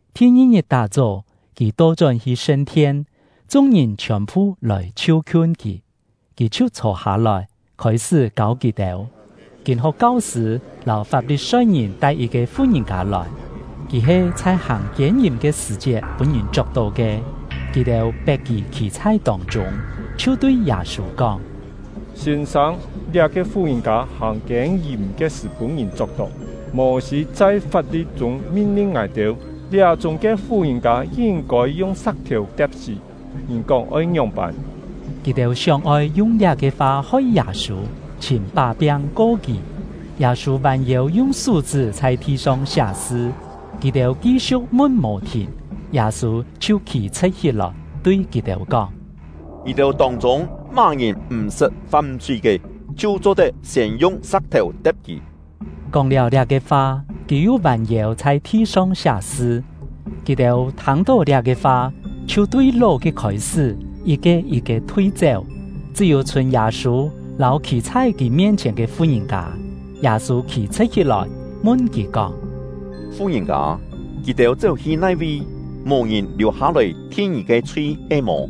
Thi-ngi-ngit tá-chó, kì to-chón hi sṳn-thien; chung-ngìn chhiòn-phu lòi chhiu-khiun kì, kì chhiu chhô-hâ-lòi, khôi-sṳ́ kâu kì-têu. Kîn-ho̍k kau-sṳ̂ lâu Fap-li-soi-ngìn tai yit-ke fu-ngìn-kâ lòi; kì he chhai hàng kiên-yìm ke sṳ̀-chiet pûn-ngìn chok-tó ke. Kì-têu pet kì khî chhai tông-chûng, chhiu tui Yâ-sû kóng: “Sîn-sâng, liá-ke fu-ngìn-kâ hàng kiên-yìm ke sṳ̀ pûn-ngìn chok-tó. Mô-sî chhai fap-li̍t-chûng min-lin ngài-têu, liá-chúng ke fu-ngìn-kâ yin-kôi yung sa̍k-thèu te̍p-sí. Ngì kóng oi ngióng-pân?” Kì-têu sióng-oi yung liá-ke fa hoi Yâ-sû, chhìm pá-piang ko kì. Yâ-sû vân-yêu yung sú-chṳ́ chhai thi-song siá sṳ. Kì-têu ki-siu̍k mun mò-thìn, Yâ-sû chhiu khî-chhṳ̍t hí-lòi, tui kì-têu kóng: “Ngì-têu tông-chûng má-ngìn m̀ sṳt fam-chhui ke, chhiu cho-tet siên yung sa̍k-thèu te̍p kì.” Kóng-liáu liá-ke fa, kì yu vân-yêu chhai thi-song siá sṳ. Kì-têu thâng-tó liá-ke fa, chhiu tui ló-ke khôi-sṳ́, yit-ke yit-ke thui-chéu, chṳ́-yû chhûn Yâ-sû lâu khî chhai kì mien-chhièn ke fu-ngìn-kâ. Yâ-sû khî-chhṳ̍t hí-lòi, mun kì kóng: “Fu-ngìn-kâ, kì-têu chéu-hi nai-vi? Mò ngìn liù-hâ-lòi thin ngì ke chhui he-mò?”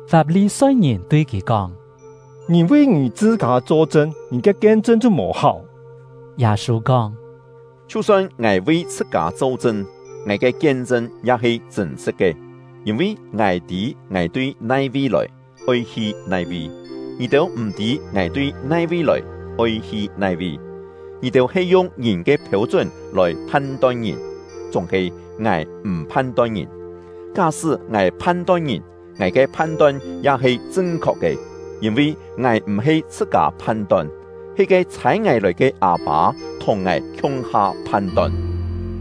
Fap-li-soi-ngìn tui kì kóng: “Ngì vi ngì chhṳ-kâ cho-chṳn; ngì ke kien-chṳn chhiu mò-háu.” Yâ-sû kóng: “Chhiu-son ngài vi chhṳ-kâ cho-chṳn, ngài ke kien-chṳn ya he chṳ̂n-sṳ̍t ke; yîn-vi ngài tî ngài tui nai-vi lòi, oi hi nai-vi. Ngì-têu m̀-tî ngài tui nai-vi lòi, oi hi nai-vi. Ngì-têu he yung ngìn ke phêu-chún lòi phan-ton ngìn; chúng-he ngài m̀ phan-ton ngìn. Ká-sṳ́ ngài phan-ton ngìn, ngài ke phan-ton ya he chṳn-khok ke; yîn-vi ngài m̀-he chhṳ-kâ phan-ton, he ke chhâi ngài lòi ke Â-pâ thùng ngài khiung-ha phan-ton.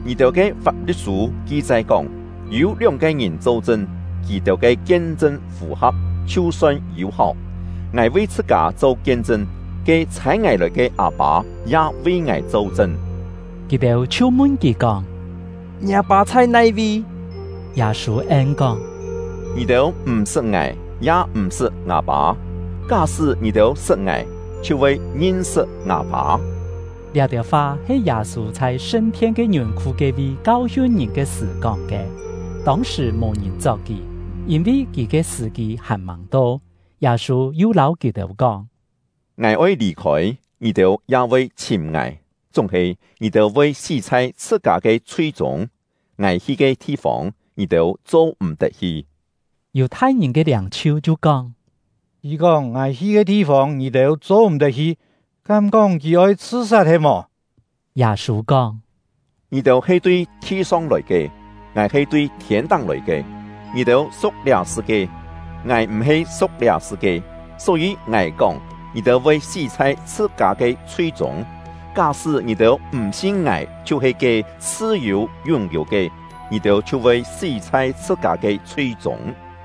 Ngì-têu ke Fap-li̍t-sû ki-chai kóng, yû lióng-ke ngìn cho-chṳn, kì-têu ke kien-chṳn fù-ha̍p, chhiu son yû-háu. Ngài vi chhṳ-kâ cho kien-chṳn; ke chhâi ngài lòi ke Â-pâ ya vi ngài cho-chṳn.” Kì-têu chhiu mun kì kóng: “Ngiâ pâ chhai nai-vi?” Yâ-sû en-kóng: “Ngì-têu m̀-sṳt ngài, ya m̀-sṳt ngâ Pâ; ká-sṳ́ ngì-têu sṳt ngài, chhiu voi ngin-sṳt ngâ Pâ.” Liá-têu fa he Yâ-sû chhai sṳn-thien ke ngiùn-khu ke-vi kau-hiun ngìn ke sṳ̀ kóng ke. Tông-sṳ̀ mò-ngìn chok kì, yîn-vi kì ke sṳ̀-kî hàn-màng to. Yâ-sû yu lâu kì-têu kóng: “Ngài oi lì-khôi, ngì-têu ya voi chhìm ngài, chúng-he ngì-têu voi sí chhai chhṳ-kâ ke chhui-chûng. Ngài hi ke thi-fông, ngì-têu cho-m̀-tet hi.” Yù-thai-ngìn ke liâng-chhiu chhiu kóng: “Kì kóng ‘Ngài hi ke thi-fông, ngì-têu cho-m̀-tet hi’, kám-kóng kì oi chhṳ-sat he-mò?” Yâ-sû kóng: “Ngì-têu he tui thi-song lòi ke, ngài he tui thiên-táng lòi ke; ngì-têu su̍k liá sṳ-kie, ngài m̀-he su̍k liá sṳ-kie. Só-yî ngài kóng, ngì-têu voi sí chhai chhṳ-kâ ke chhui-chûng. Ká-sṳ́ ngì-têu m̀ sin ngài chhiu-he ke ‘Chhṳ-yû Yún-yû’ ke, ngì-têu chhiu voi sí chhai chhṳ-kâ ke chhui-chûng.”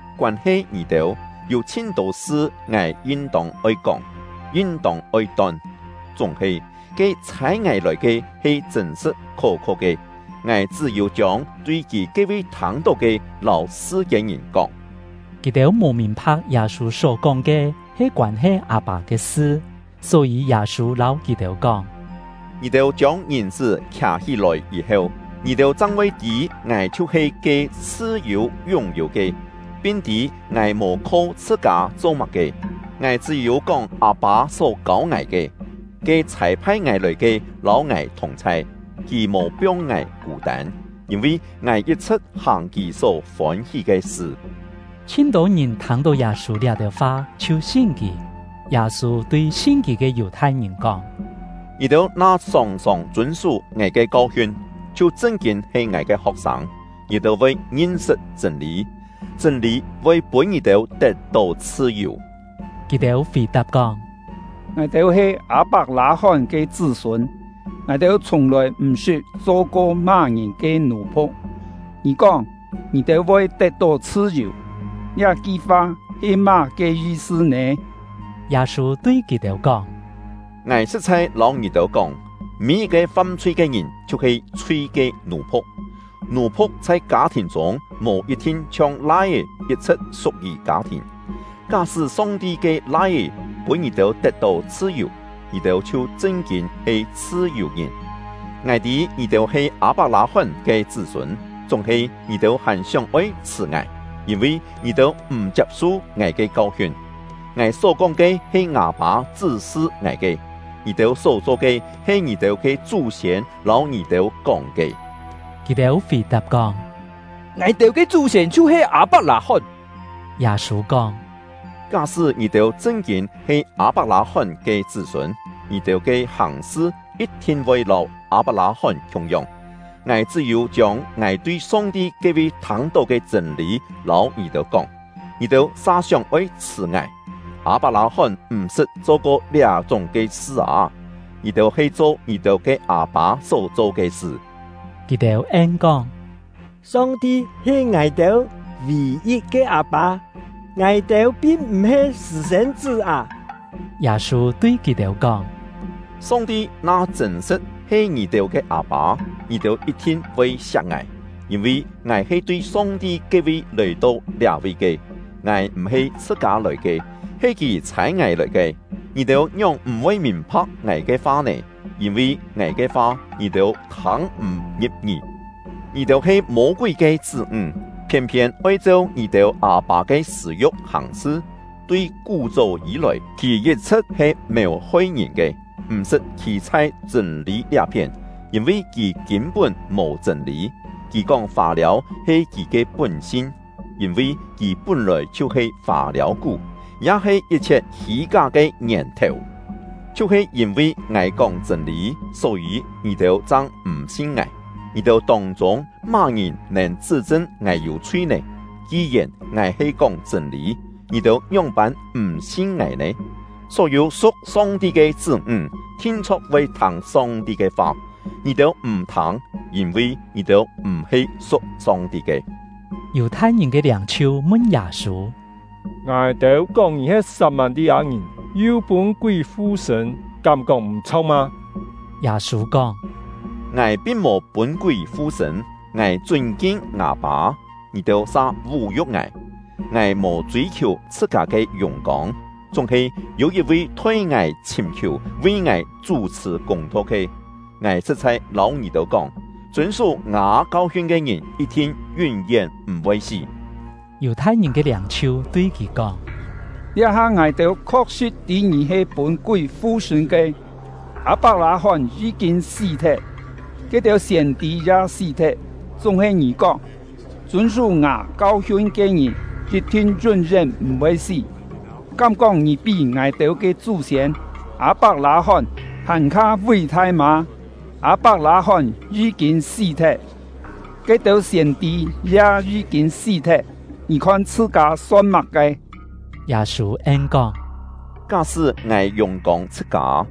Koân-he ngì-têu, yû chhin-tô sṳ ngài yin-tông oi kóng, yin-tông oi ton. Chúng-he, ke ‘Chhâi ngài lòi ke’ he chṳ̂n-sṳ̍t khó-kho ke; ngài chṳ́-yû chiông tui Kì ke-vi thâng-tó ke lâu sṳ-kiên-ngìn kóng.” Kì-têu mò mìn-pha̍k Yâ-sû só-kóng ke he koân-he Â-pâ ke sṳ. Só-yî Yâ-sû lâu kì-têu kóng: “Ngì-têu chiông Ngìn-chṳ́ khià-hí-lòi yî-heu, ngì-têu chang voi tî ngài chhiu-he ke ‘Chhṳ-yû Yún-yû’ ke, pin tî ngài mò kho chhṳ-kâ cho má-ke, ngài chṳ́-yû kóng Â-pâ só kâu ngài ke. Ke chhâi-phai ngài lòi ke lâu ngài thùng-chhai; Kì mò piong ngài kû-tân, yîn-vi ngài yit-chhṳ̍t hàng Kì só fôn-hí ke sṳ.” Chhin-tô ngìn thâng-tó Yâ-sû liá-têu fa chhiu sin kì. Yâ-sû tui sin kì ke Yù-thai-ngìn kóng: “Ngì-têu na sòng-sòng chûn-sú ngài ke kau-hiun, chhiu chṳn-kîn he ngài ke ho̍k-sâng; ngì-têu voi ngin-sṳt chṳ̂n-lî, chṳ̂n-lî voi pûn ngì-têu tet-tó chhṳ-yù.” Kì-têu fì-tap kóng: “Ngài-têu he Â-pak-lâ-hón ke chṳ́-sûn; ngài-têu chhiùng-lòi m̀-sṳt cho-ko má-ngìn ke nù-phu̍k. Ngì kóng ‘Ngì-têu voi tet-tó chhṳ-yù’, liá-ki fa he má-ke yi-sṳ nè?” Yâ-sû tui kì-têu kóng: “Ngài sṳ̍t-chhai lâu ngì-têu kóng, mî-yit-ke fam-chhui ke ngìn chhiu-he chhui ke nù-phu̍k. Nù-phu̍k chhai kâ-thìn chûng mò yit-thin chhiong lai-é yit-chhṳ̍t su̍k-yì kâ-thìn. Ká-sṳ́ Song-ti ke Lai-é pûn ngì-têu tet-tó chhṳ-yù, ngì-têu chhiu chṳn-kîn he chhṳ-yù-ngìn. Ngài tî ngì-têu he Â-pak-lâ-hón ke chṳ́-sûn; chúng-he ngì-têu hàn sióng-oi chhṳ̀ ngài, yîn-vi ngì-têu m̀ chiap-su ngài ke kau-hiun. Ngài só-kóng ke he ngâ Pâ chṳ́-sṳ ngài ke, ngì-têu só-cho ke he ngì-têu ke chú-siên lâu ngì-têu kóng ke.” Kì-têu fì-tap kóng: “Ngài-têu ke chú-siên chhiu-he Â-pak-lâ-hón.” Yâ-sû kóng: “Ká-sṳ́ ngì-têu chṳn-kîn he Â-pak-lâ-hón ke chṳ́-sûn, ngì-têu ke hàng-sṳ yit-thin voi lâu Â-pak-lâ-hón khiung-yong. Ngài chṳ́-yû chiông ngài tui Song-ti ke-vi thâng-tó ke chṳ̂n-lî lâu ngì-têu kóng, ngì-têu sa sióng-oi chhṳ̀ ngài. Â-pak-lâ-hón m̀-sṳt cho-ko liá-chúng ke sṳ â! Ngì-têu he cho ngì-têu ke â-pâ só cho ke sṳ.” Kì-têu en-kóng: “Song-ti he ngài-têu vì-yit ke Â-pâ; ngài-têu pin m̀-he sṳ̂-sên-chṳ́ â!” Yâ-sû tui kì-têu kóng: “Song-ti na chṳ̂n-sṳ̍t he ngì-têu ke Â-pâ, ngì-têu yit-thin voi siak ngài; yîn-vi ngài he tui Song-ti ke-vi lòi-to liá-vi ke. Ngài m̀-he chhṳ-kâ lòi ke, he Kì chhâi ngài lòi ke. Ngì-têu ngióng m̀-voi mìn-pha̍k ngài ke fa nè? Yîn-vi ngài ke fa, ngì-têu thâng m̀ ngi̍p-ngí. Ngì-têu he Mô-kúi ke chṳ́-ńg, phiên-phiên oi cheu ngì-têu â-pâ ke sṳ̂-yu̍k hàng-sṳ. Tui kú-chó yî-lòi, kì yit-chhṳ̍t he mèu-hoi ngìn ke, m̀-sṳt khî chhai chṳ̂n-lî liá-phién, yîn-vi kì kîn-pún mò chṳ̂n-lî. Kì kóng fâ-liâu he kì ke pún-sin; yîn-vi kì pún-lòi chhiu-he fâ-liâu-kú, ya he yit-chhiet hî-ká ke ngièn-thèu. Chhiu-he yîn-vi ngài kóng chṳ̂n-lî, só-yî ngì-têu chang m̀ sin ngài. Ngì-têu tông-chûng má-ngìn nèn chṳ́-chṳn ngài yû chhui nè? Ki-yèn ngài he kóng chṳ̂n-lî, ngì-têu ngióng-pân m̀ sin ngài nè? Só-yû su̍k Song-ti ke chṳ́-ńg, thin-chho̍k voi thâng Song-ti ke fa. Ngì-têu m̀ thâng, yîn-vi ngì-têu m̀-he su̍k Song-ti ke.” Yù-thai-ngìn ke liâng-chhiu mun Yâ-sû: “Ngài-têu kóng ngì he Sat-mâ-li-â-ngìn, yu pûn kúi fu-sṳ̂n, kám-kóng m̀-chho̍k mâ?” Yâ-sû kóng: “Ngài pin mò pûn kúi fu-sṳ̂n; ngài chûn-kin ngâ Pâ, ngì-têu sa vú-yu̍k ngài. Ngài mò chûi-khiù chhṳ-kâ ke yùng-kông, chúng-he yû yit-vi thoi ngài chhìm-khiù, vi ngài chú-chhṳ̀ kûng-tho ke. Ngài sṳ̍t-chhai lâu ngì-têu kóng, chûn-sú ngâ kau-hiun ke ngìn yit-thin yún-yén m̀-voi sí.” Yù-thai-ngìn ke liâng-chhiu tui kì kóng: “Liá-ha ngài-têu khok-sṳ̍t tî ngì he pûn kúi fu-sṳ̂n ke! Â-pak-lâ-hón yí-kîn sí-thet, ke-têu siên-tî ya sí-thet, chúng-he ngì kóng: ‘Chûn-sú ngâ kau-hiun ke ngìn yit-thin yún-yén m̀-voi sí.’ Kám-kóng ngì pí ngài-têu ke chú-siên Â-pak-lâ-hón hàn-kha ví-thai mâ? Â-pak-lâ-hón yí-kîn sí-thet, ke-têu siên-tî ya yí-kîn sí-thet, ngì khon chhṳ-kâ son má-ke?” Yâ-sû en-kóng: “Ká-sṳ́ ngài yùng-kông chhṳ-kâ,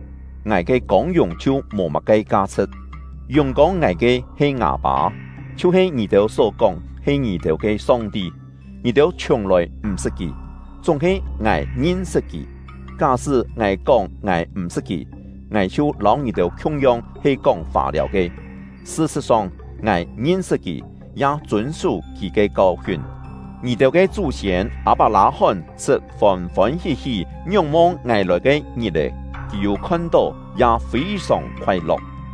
ngài ke kông-yùng chhiu mò má-ke ka-chhṳ̍t. Yùng-kông ngài ke he ngâ Pâ, chhiu-he ngì-têu só kóng he ngì-têu ke Song-ti. Ngì-têu chhiùng-lòi m̀-sṳt Kì, chúng-he ngài ngin-sṳt Kì. Ká-sṳ́ ngài kóng ngài m̀ sṳt Kì, ngài chhiu lâu ngì-têu khiung-yong he kóng fâ-liâu ke. Sṳ-sṳ̍t-song, ngài ngin-sṳt Kì, ya chûn-sú Kì ke kau-hiun. Ngì-têu ke chú-siên Â-pak-lâ-hón sṳt fôn-fôn hí-hí ngióng-mong ngài lòi ke ngit-è; kì yû khon-tó, ya fî-sòng khoai-lo̍k.”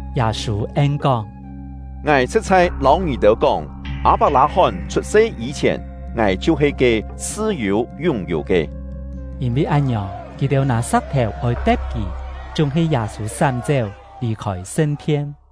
Yâ-sû en-kóng: “Ngài sṳ̍t-chhai lâu ngì-têu kóng, Â-pak-lâ-hón chhut-se yî-chhièn, ngài chhiu-he ke ‘Chhṳ-yû Yún-yû’ ke.” Yîn-vi án-ngiòng, kì-têu nâ sa̍k-thèu oi te̍p kì; chúng-he Yâ-sû sám-chéu, lì-khôi sṳn-thien.